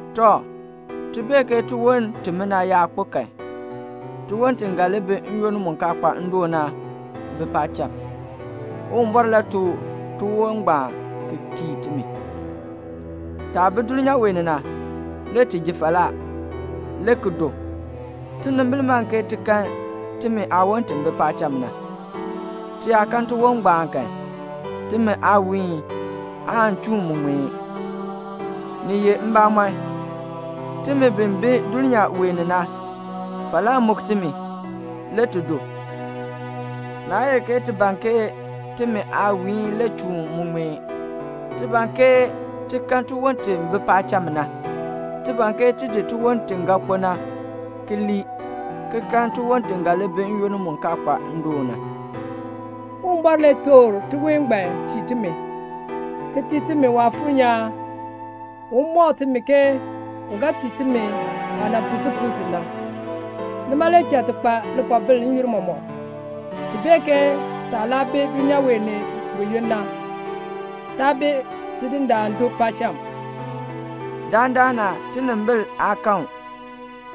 Tɔ, ti bee ke tiwon timina yaa kpo kan, tiwon ti ga li bi n-yoonn mu kaa kpa ndoon na bi paacham. Uwumbɔr le toor tiwon ngbaan ki tii timi. Taah bi dulnyaa wee ni na, le ti ji falaa, le ki du. Tinimbil man ke ti kan timi aawon ti bi paacham na. Ti yaa kan tiwon ngbaan kan, timi aawiin aan chuun mu ŋmeen. Ni ye mbamɔn, timi bi bi dulnyaa wee ni na, falaa muk timi, le ti du. Naa ye ke ti ban ke timi aawiin le chuun mu ŋmeen. Ti ban ke ti kan tiwon ti bi paacham na. Ti ban ke ti di tiwon ti ga kpo na ki lii, ki kan tiwon ti ga li bi n-yoonn mu kaa kpa ndoon na. Uwumbɔr le toor tiwon ngbaan tii timi, ki tii timi Waafuur nyaan un mɔk timi ke u ga tii timi waah nan puu tipuul ti na. Nima le cha ti kpa lipoobil n-yoonn mɔmɔk. Ti bee ke taah laa bi dulnyaa wee ni buyoonn na, taa bi Tidindaan do paacham. Dandana tinimbil aa kan u.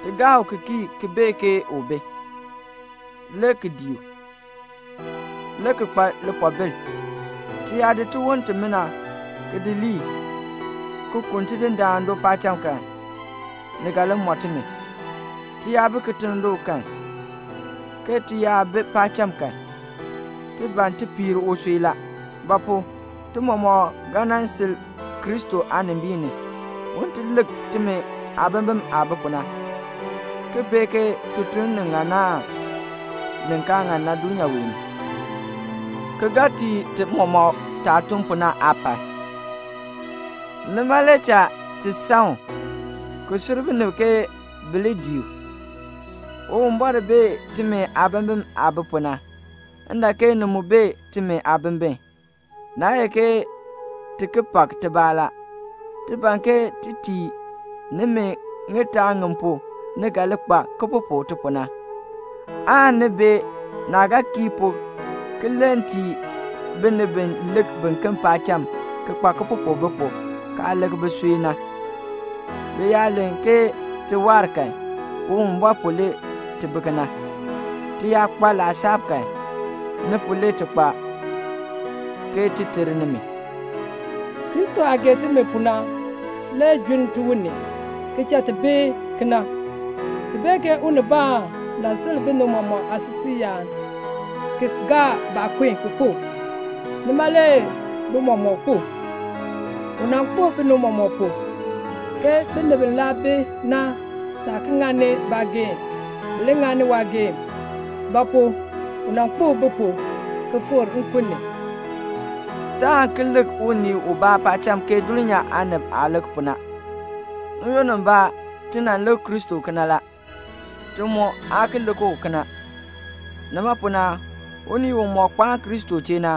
Ti gaa u ki kii ki bee ke u bi, le ki dii u, le ki kpa lipoobil. Ti yaa di tiwon timina ki di lii, ki kun Tidindaan do paacham kan, ni ga li mɔ timi. Ti yaa bi kitiŋ du kan, ke ti yaa bi paacham kan, ti ban ti piir usui la. Ba pu? ti mɔmɔk ga nan sil Kristo aanimbiin ni, un ti lik timi aabimbin aah bi pu na, ki bee ke ti tun ni ŋan na aan ni kaa ŋan na dulnyaa wee ni, ki ga tii ti mɔmɔk taah tun pu na aapal. Nima le cha ti san u, ki sur binib ke bi li dii u. Uwumbɔr bee timi aabimbin aah bi pu na. M dak ke ni mu bee timi aabimbin. Naa ye ke ti ki pak tibaa la. Ti ban ke ti tii nimi ŋitaa ŋi pu ni ga li kpa kipupuk ti pu na, aan ni bee naah ga kii pu ki len tii binib bi lik biken paacham, ki kpa kipupuk bi pu, kaa lik bisui na. Bi yaa len ke ti waar kan, Uwumbɔr pu le ti bi kena. Ti yaa kpa laasab kan, ni pu le ti kpa, ke ti ter nimi. Kristo aah gee timi pu na le junn tiwon ni, ki cha ti bi kena. Ti bee ke unibaan nan sil binib mɔmɔk aasisiiyaan ki gaa baakun ki kpo, nima le bi mɔmɔk kpo. U nan kpo binib mɔmɔk pu, ke binib bi laa bi na taa ki ŋani baageehn, bi li ŋani waageehn; ba pu? u nan kpo bi pu ki fikr nkun ni. Taan ki lik unii ubaa paacham ke dulnyaa aanib aah lik pu na. N-yoonn mbaa ti nan lik Kristo kena la. Ti mu aa ki lik u kena. Nima pu na, unii umɔk kpaan Kristo chee na,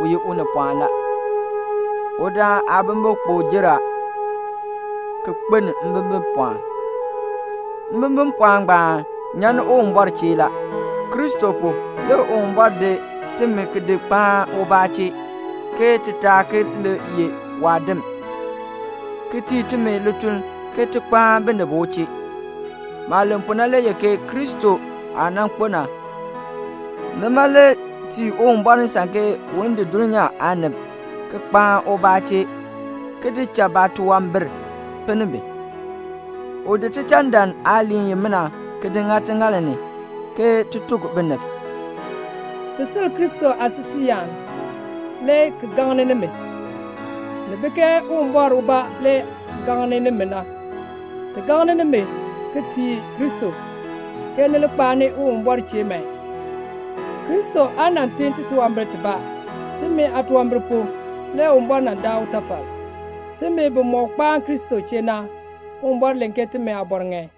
u ye unipɔɔn la. Udaan aabimbikpok jer a, ki kpeln mbimbipɔɔn. Mbimbipɔɔn ngbaan nyan ni Uwumbɔr chee la. Kristo pu, le Uwumbɔr di timi ki di kpaan ubaa chee, ke ti taa ki li ye waadim, ki tii timi lituln ke ti kpaan binib u chee. Maah len pu na le ye ke Kristo aah nan kpo na, nima le tii Uwumbɔr nsan ke un di dulnyaa aanib ki kpaan ubaa chee, ki di cha baatunwambir pinn bi. U di tichandaan aaliin imina ki di ŋa tiŋaal ni, ke ti tuk binib. Ti sil Kristo aasisiiyaan, le ki gaŋni nimi. Ni bi ke Uwumbɔr ubaa le gaŋni nimi na. Ti gaŋni nimi ki tii Kristo, ke ni li kpaani Uwumbɔr chee man. Kristo aa nan tun titunwambir tibaa. Timi aatunwambir pu, le Uwumbɔr nan daa utafal. Timi bimɔk kpaan Kristo chee na, Uwumbɔr len ke timi aabɔr ŋan.